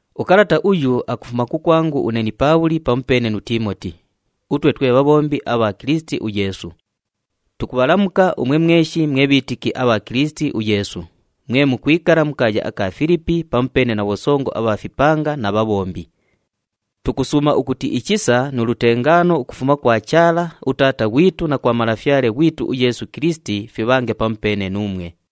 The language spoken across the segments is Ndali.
Ukalata uyu akufuma kukwangu une ni Paabhuli pamupeene nu Tiimoti, utwe twe bhabhombi abha Kilisiti uYeesu. Tukubhalamuka umwe mweshi mwe bhiitiki abha Kilisiti uYeesu, mwe mukwikala mu kaaya aka Filipi pamupeene na bhosongo abha fipanga na bhabhombi. Tukusuuma ukuti ichisa nu lutengaano ukufuma kwa Chaala uTaata ghwitu na kwa Malafyale ghwitu uYeesu Kilisiti fibhange pamupeene nuumwe.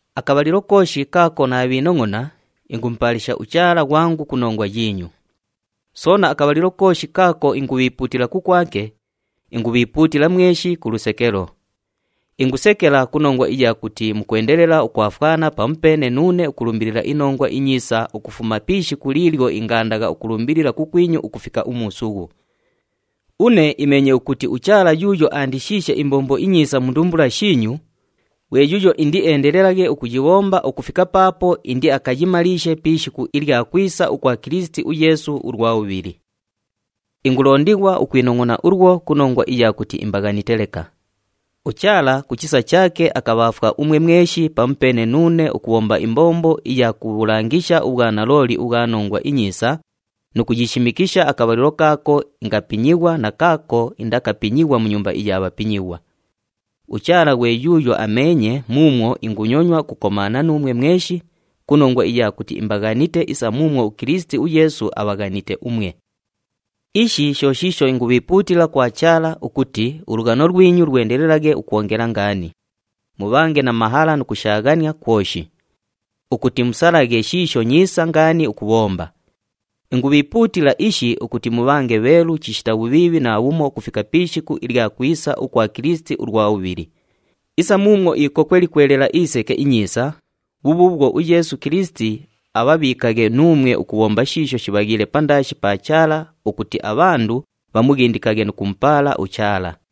Akabhalilo kooshi kaako naabhiinongʼona, ingumupaalisha uChaala ghwangu ku nongwa yiinyu. Soona akabhalilo kooshi kaako ingubhiipuutila kukwake, ingubhiipuutila mweshi ku lusekelo. Ingusekela ku nongwa iya kuti mukwendelela ukwafwana pamupeene nuune ukulumbilila iNongwa iNyiisa ukufuma pi ishiku liilyo ingaandagha ukulumbilila kukwinyu ukufika umuusughu. Une imeenye ukuti uChaala yuuyo aandishiishe imbombo inyiisa mu ndumbula shiinyu, ghwe yuuyo indieendelelaghe ukuyibhomba ukufika paapo indiakayimaliishe pi ishiku ilya kwisa ukwa Kilisiti uYeesu ulwa bhubhili. Ingulondighwa ukwinongʼona ulwo ku nongwa iya kuti imbaghanite leka. UChaala ku chisa chaake akabhaafwa umwe mweshi pamupeene nuune ukubhomba imbombo iya kubhulangisha ubhwanalooli ubhwa Nongwa iNyiisa nu kuyishimikisha akabhalilo kaako ingapinyighwa na kaako indakapinyighwa mu nyumba iya bhapinyighwa. UChaala ghwe yuuyo ameenye muumwo ingunyonywa ukukomaana nuumwe mweshi ku nongwa iya kuti imbaghanite isa muumwo uKilisiti uYeesu abhaghanite umwe. Ishi sho shiisho ingubhiipuutila kwa Chaala ukuti ulughano lwinyu lwendelelaghe ukwongela ngaani, mubhange na mahala nu kushaaghania kwoshi, ukuti musalaghe shiisho nyiisa ngaani ukubhomba. Ingubhiipuutila ishi ukuti mubhange bheelu chishita bhubhiibhi naabhumo ukufika pi ishiku ilya kwisa ukwa Kilisiti ulwa bhubhili. Isa muumwo ikokwe likwelagha iseke inyiisa, bhubhuubhwo uYeesu Kilisiti abhabhiikaghe nuumwe ukubhomba shiisho shibhaghiile pandaashi pa Chaala ukuti abhandu bhamughindikaghe nu kumupaala uChaala.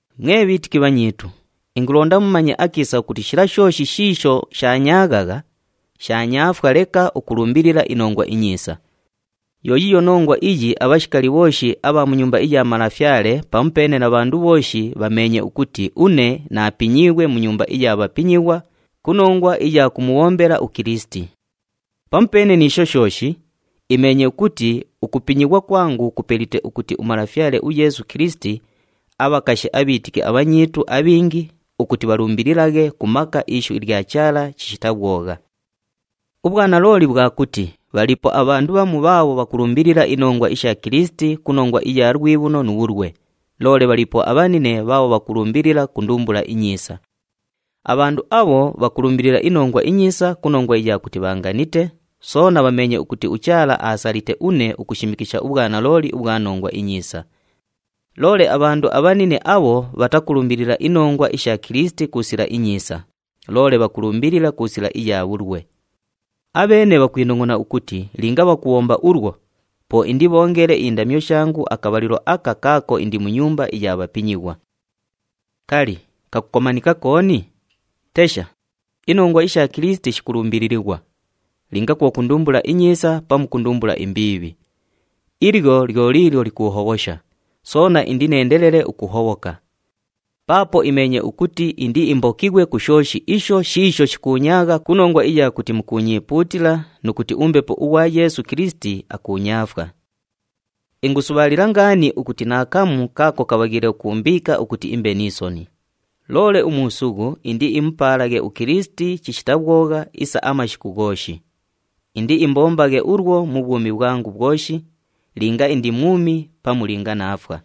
Mwe bhiitiki bhanyiitu, ingulonda mumanye akiisa ukuti shila shooshi shiisho shaanyaaghagha, shaanyaafwa leka ukulumbilila iNongwa iNyiisa. Yo yiiyo nongwa iyi abhashikali bhooshi abha mu nyumba iya malafyale pamupeene na bhandu bhooshi bhameenye ukuti une naapinyiighwe mu nyumba iya bhapinyighwa ku nongwa iya kumubhombela uKilisiti. Pamupeene ni isho shooshi, imeenye ukuti ukupinyighwa kwangu kupelite ukuti uMalafyale uYeesu Kilisiti abhakashe abhiitiki abhanyiitu abhingi ukuti bhalumbililaghe ku maka ishu ilya Chaala chishita bhwogha. Ubhwanalooli bhwa kuti bhaliipo abhandu bhamu bhaabho bhakulumbilila inongwa isha Kilisiti ku nongwa iya lwibhuno ni ya bhulwe, loole bhaliipo abhanine bhaabho bhakulumbilila ku ndumbula inyiisa. Abhandu abho bhakulumbilila iNongwa iNyiisa ku nongwa iya kuti bhaanganite, soona bhameenye ukuti uChaala aasalite une ukushimikisha ubhwanalooli ubhwa Nongwa iNyiisa. Loole abhandu abhanine abho bhatakulumbilila inongwa isha Kilisiti ku sila inyiisa, loole bhakulumbilila ku sila iya bhulwe. Abheene bhakwinongʼona ukuti linga bhakubhomba ulwo, po indibhoongele indamyo shangu akabhalilo aka kaako indi mu nyumba iya bhapinyighwa. Kali, kakukomanika kooni? Tesha, inongwa isha Kilisiti shikulumbililighwa, linga kwo ku ndumbula inyiisa pamu ku ndumbula imbiibhi. Ilyo lyo liilyo likuuhobhosha, soona indineendelele ukuhobhoka. Paapo imeenye ukuti indiimbokighwe ku shooshi isho shiisho shikuunyaagha ku nongwa iya kuti mukuunyiipuutila nu kuti uMbepo ughwa Yeesu Kilisiti akuunyaafwa. Ingusubhaalila ngaani ukuti naakamu kaako kabhaghiile ukuumbiika ukuti imbe ni soni. Loole umuusughu indiimupaalaghe uKilisiti chishita bhwogha isa amashiku ghooshi. Indiimbombaghe ulwo mu bhwumi bhwangu bhwoshi, linga indi mwumi pamu linga naafwa.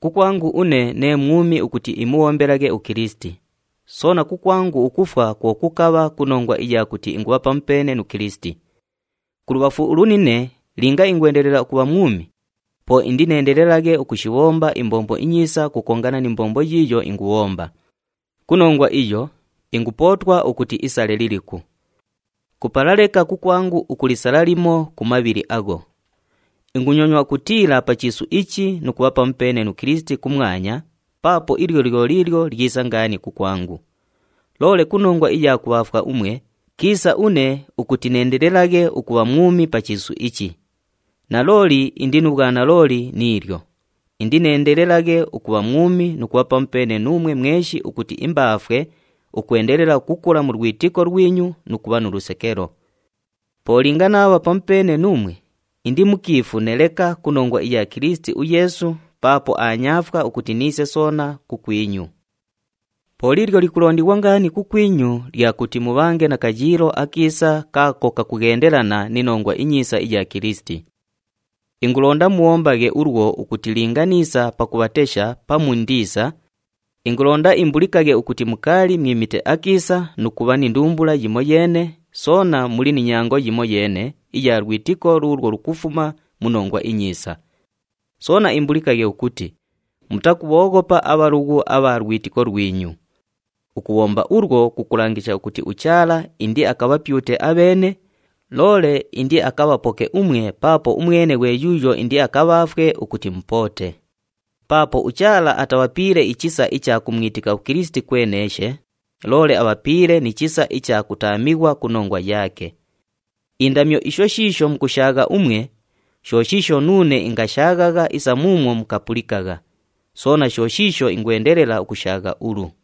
Kukwangu une nee mwumi ukuti imubhombelaghe uKilisiti, soona kukwangu ukufwa kwo kukabha ku nongwa iya kuti ingubha pamupeene nu Kilisiti. Kulubhafu ulunine linga ingwendelela ukubha mwumi, po indineendelelaghe ukushibhona imbombo inyiisa ukukongana ni mbombo yiiyo ingubhomba. Ku nongwa iyo, ingupootwa ukuti isale liliku. Kupala leka kukwangu ukulisala limo ku mabhili agho. Ingunyonywa ukutiila pa chiisu ichi nu kubha pamupeene nu Kilisiti kumwanya paapo ili lyo liilyo lyisa ngaani kukwangu. Loole ku nongwa iya kubhaafwa umwe, kiisa une ukuti neendelelaghe ukubha mwumi pa chiisu ichi. Nalooli indi nu bhwanalooli ni ilyo, indineendelelaghe ukubha mwumi nu kubha pamupeene nuumwe mweshi ukuti imbaafwe ukwendelela ukukula mu lwitiko lwinyu nu kubha nu lusekelo. Po linga naabha pamupeene nuumwe, indimukiifune leka ku nongwa iya Kilisiti uYeesu paapo aanyaafwa ukuti niise soona kukwinyu. Po liilyo likulondighwa ngaani kukwinyu lya kuti mubhange na kayiilo akiisa kaako kakughendelana ni Nongwa iNyiisa iya Kilisiti. Ingulonda mubhombaghe ulwo ukuti linga niisa pakubhatesha pamu indiisa, ingulonda imbulikaghe ukuti mukaali mwimite akiisa nu kubha ni ndumbula yimoyeene, soona muli ni nyango yimoyeene iya lwitiko luulwo lukufuma mu Nongwa iNyiisa. Soona imbulikaghe ukuti mutakubhooghopa abhalughu abha lwitiko lwinyu. Ukubhomba ulwo, kukulangisha ukuti uChaala indiakabhapyute abheene, loole indiakabhapoke umwe paapo umwene ghwe yuuyo indiakabhaafwe ukuti mupoote. Paapo uChaala atabhapiile ichisa icha kumwitika uKilisiti kweneeshe, loole abhapiile ni chisa icha kutaamighwa ku nongwa yaake. Indamyo isho shiisho mukushaagha umwe, sho shiisho nuune ingashaaghagha isa muumwo mukapulikagha, soona sho shiisho ingwendelela ukushaagha ulu.